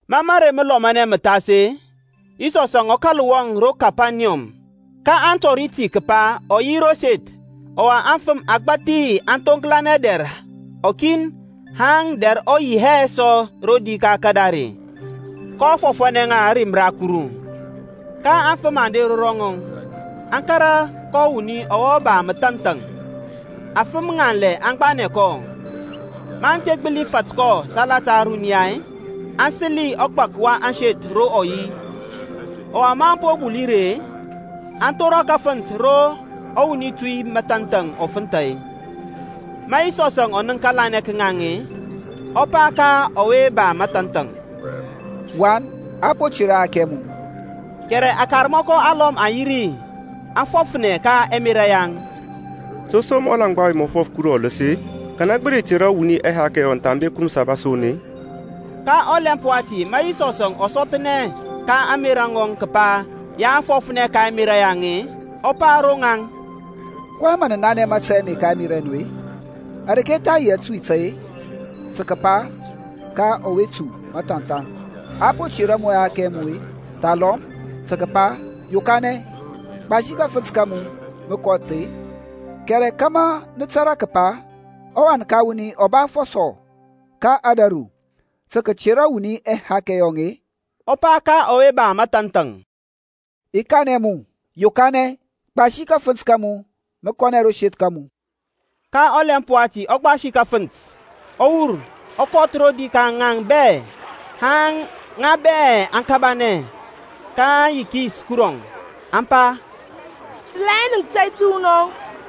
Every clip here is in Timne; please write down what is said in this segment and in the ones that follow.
Ma mərey məlɔmanɛ mə thas-e, Yisɔsȧŋ ɔ kȧl wɔŋ ro Kepaniyɔm. Ka a tɔri ti kəpa ɔ yi ro seth. Ɔwa afəm agbȧthi aŋ thoŋklanɛ dɛr ɔkin haŋ dɛr ɔ yi hɛ sɔ rodi ka kadare, kɔ fɔfȧnɛ ŋa ȧrim ra Kuru. Ka afəm aŋ der ro ŋɔŋ, aŋ kȧrȧ kɔ wuni ɔwe ba məthanthaŋ, afəm ŋanlɛ aŋ gbanɛ kɔ. Maŋ te gbəli fat kɔ salata ȧruniya-e, aŋ səli ɔgbak wa ȧŋseth ro ɔ yi, ɔwa maŋ po buli ri-e, aŋ thora kafənt ro ɔwuni tu məthanthaŋ ɔ fənthȧ. Ma Yisɔsȧŋ ɔ nənk kȧlanɛ ka ŋaŋ-e, ɔ pa ka ɔwe ba mathanthaŋ, Wan, a po tera ɛhakɛ ɛ mu. Kɛrɛ akarmɔkɔ alɔm aŋ yirȧ ri, aŋ fɔfnɛ ka ɛmerȧ yaŋ, To som ɔlaŋgba ɔwe mə fɔf Kuru ɔləs-e? Kanɛ gbəli tera wuni ɛhakɛ thambe Kuru Məsaba son-e? Ka ɔlɛmp wati ma Yisɔs ɔ sɔthnɛ ka ȧŋmerȧ ŋɔŋ kəpa ya aŋ fɔfnɛ ka ɛmerȧ yaŋ-e, ɔ pa ro rɔŋaŋ, kɔyɛŋ mə nə nanɛ mȧtȧy ame ka ɛmerȧ ɛ nu-e? Areke tha yi atuy tȧy, tə kəpa ka ɔwe tu məthanthaŋ, A po tera mu ɛhakɛ ɛ mu-e, thalɔm tə kəpa, Yokanɛ, gbasi kafənt ka mu, mə kɔth-e? Kɛrɛ kȧmȧ nə tȧrȧ kəpa ɔWan ka wuni ɔ ba afɔsɔ ka ȧdȧru tə kətera wuni ɛhakɛ yɔŋ-e, ɔ pa ka ɔwe ba mathanthaŋ, I kanɛ mu, Yokanɛ, gbasi kafənt ka mu mə kɔ ro seth ka mu. Ka ɔlɛmp wati ɔ gbasi kafənt, ɔ wur, ɔ kɔth rodi ka ŋaŋ bɛ, haŋ ŋa bɛ aŋ kabanɛ, kaŋ yikis Kurɔŋ, aŋ pa, Sə la hɛ nənk tȧy təwunɔŋ.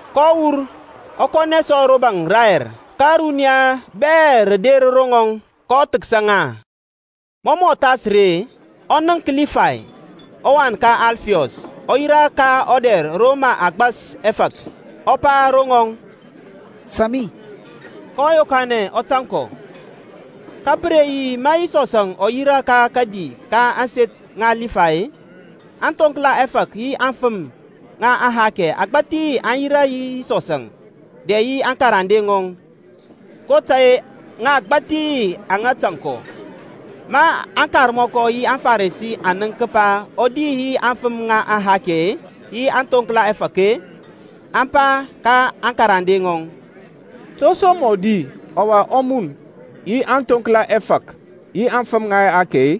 kɔ wur, ɔ kɔnɛ sɔ ro baŋ rayɛr, ka ȧruniya bɛ rə der ro ŋɔŋ, kɔ thəksa ŋa. Mɔ mɔ thas ri-e, ɔ nənk Libay, ɔwan ka Alfiɔs, ɔ yirȧ ka ɔdɛr ro mə a gbasi ɛfȧk, ɔ pa ro ŋɔŋ, Tȧŋ mi. Kɔ yokanɛ ɔ tȧŋ kɔ. Ka pə re yi ma Yisɔsȧŋ ɔ yirȧ ka kədi ka ȧŋseth ŋa Libay-e, aŋthoŋkla ɛfȧk yi aŋfəm ŋa ɛhakɛ agbȧthi aŋ yirȧ yi Yisɔsȧŋ dɛ yi aŋkarande ŋɔŋ, kotȧy-e ŋa agbȧthi aŋa tȧŋ kɔ. Ma aŋkarmɔkɔ yi aŋFarisi aŋ nənk kəpa ɔ di yi aŋfəm ŋa ɛhakɛ yi aŋthoŋkla ɛfȧk-e, aŋ pa ka aŋkarande ŋɔŋ, To som mɔ di ɔwa ɔ mun yi aŋthoŋkla ɛfȧk yi aŋfəm ŋa ɛhakɛ-e?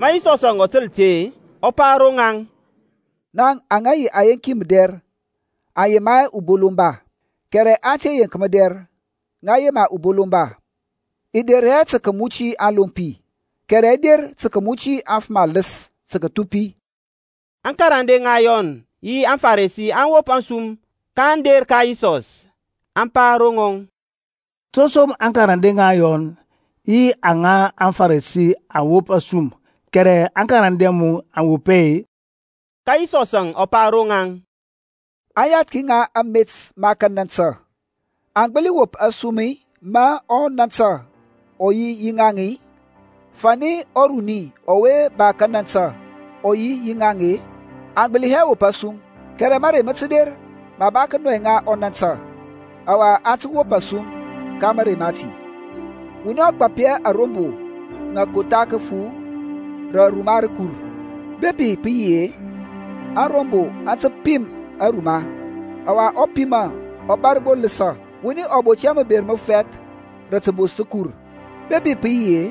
Ma Yisɔs ɔ təl ti-e, ɔ pa ro ŋaŋ, Ŋaŋ aŋa yi ayenki mədɛr aŋ yema hɛ ubolomba, kɛrɛ ante yeŋki mədɛr, ŋa yema ubolomba. I der hɛ tə kəmuti aŋlompi, kɛrɛ i der tə kəmuti aŋfəm aləs tə kəthupi. Aŋkarande ŋa Yɔn yi aŋFarisi aŋ wop asum, kaŋ der ka Yisɔs, aŋ pa ro ŋɔŋ, To som aŋkarande ŋa Yɔn yi aŋa aŋFarisi aŋ wop asum, kɛrɛ aŋkarande a mu aŋ wop hɛ-e? Ka Yisɔsȧŋ ɔ pa ro ŋaŋ, Aŋyathki ŋa amet ma kanantə aŋ gbəli wop asum-i ma ɔnantə ɔ yi yi ŋaŋ-i? Fani ɔruni ɔwe ba kanantə ɔ yi yi ŋaŋ-e aŋ gbəli hɛ wop asum. Kɛrɛ mȧrey mə tə der ma a ba kənɔi ŋa ɔnantə, ɔwa aŋ tə wop asum ka mȧrey mati. Wuni ɔ gbap hɛ arombo ŋa kotha kəfu rə ruma rəkur. Bepi pə yi yi-e, ȧŋrombo aŋ tə pim aruma, ɔwa ɔpima ɔ bȧr gbo ləsȧ. Wuni ɔ bot hɛ məber məfɛth rə təbos təkur. Bepi pə yi yi-e,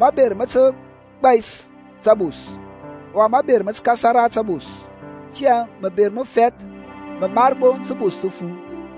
maber mə tə gbai tabos, ɔwa maber mə tə kasara yi tabos. Tiyȧŋ məber məfɛth mə mar gbo təbos təfu.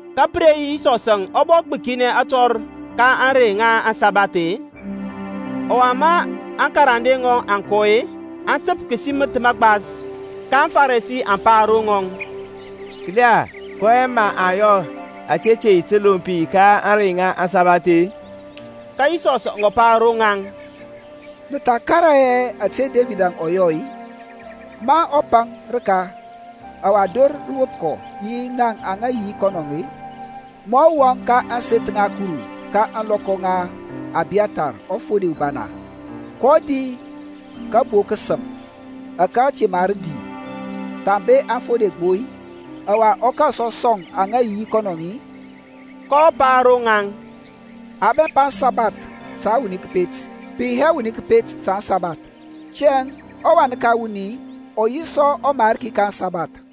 Ka pə re yi Yisɔsȧŋ ɔ bɔ gbəkinɛ atɔr ka ȧŋrey ŋa aŋsabath-e. Ɔwa aŋkarande ŋɔŋ maŋ kɔ-e, aŋ təp kəsiməth məgbas. Ka aŋFarisi aŋ pa ro ŋɔŋ, Kəla, kɔyɛŋ mə aŋ yɔ ȧte te yi təlompi ka ȧŋrey ŋa aŋsabath-e? Ka Yisɔs ɔ pa ro ŋaŋ, Nə tha karaŋ hɛ ȧte Debid ɔ yɔ-i, ma ɔ paŋ rəka, ɔwa dor rə wop kɔ yi ŋaŋ aŋa yi dɛ yi kɔnɔ-i? Mɔ ɔ wɔŋ ka ȧŋseth ŋa Kuru ka ȧŋlɔkɔ ŋa Abiyathar ɔfode ubana, kɔ di kabo kəsəm ȧke te mar di thambe aŋfode gbo-i, ɔwa ɔ kȧl sɔ sɔŋ aŋa yi yi kɔnɔ-i? kɔ pa ro ŋaŋ, A bɛmpa aŋsabath ta wuni kəpet, pə yi hɛ wuni kəpet ta aŋsabath. Tiyȧŋ ɔWan ka wuni ɔ yi sɔ ɔMarki ka aŋsabath.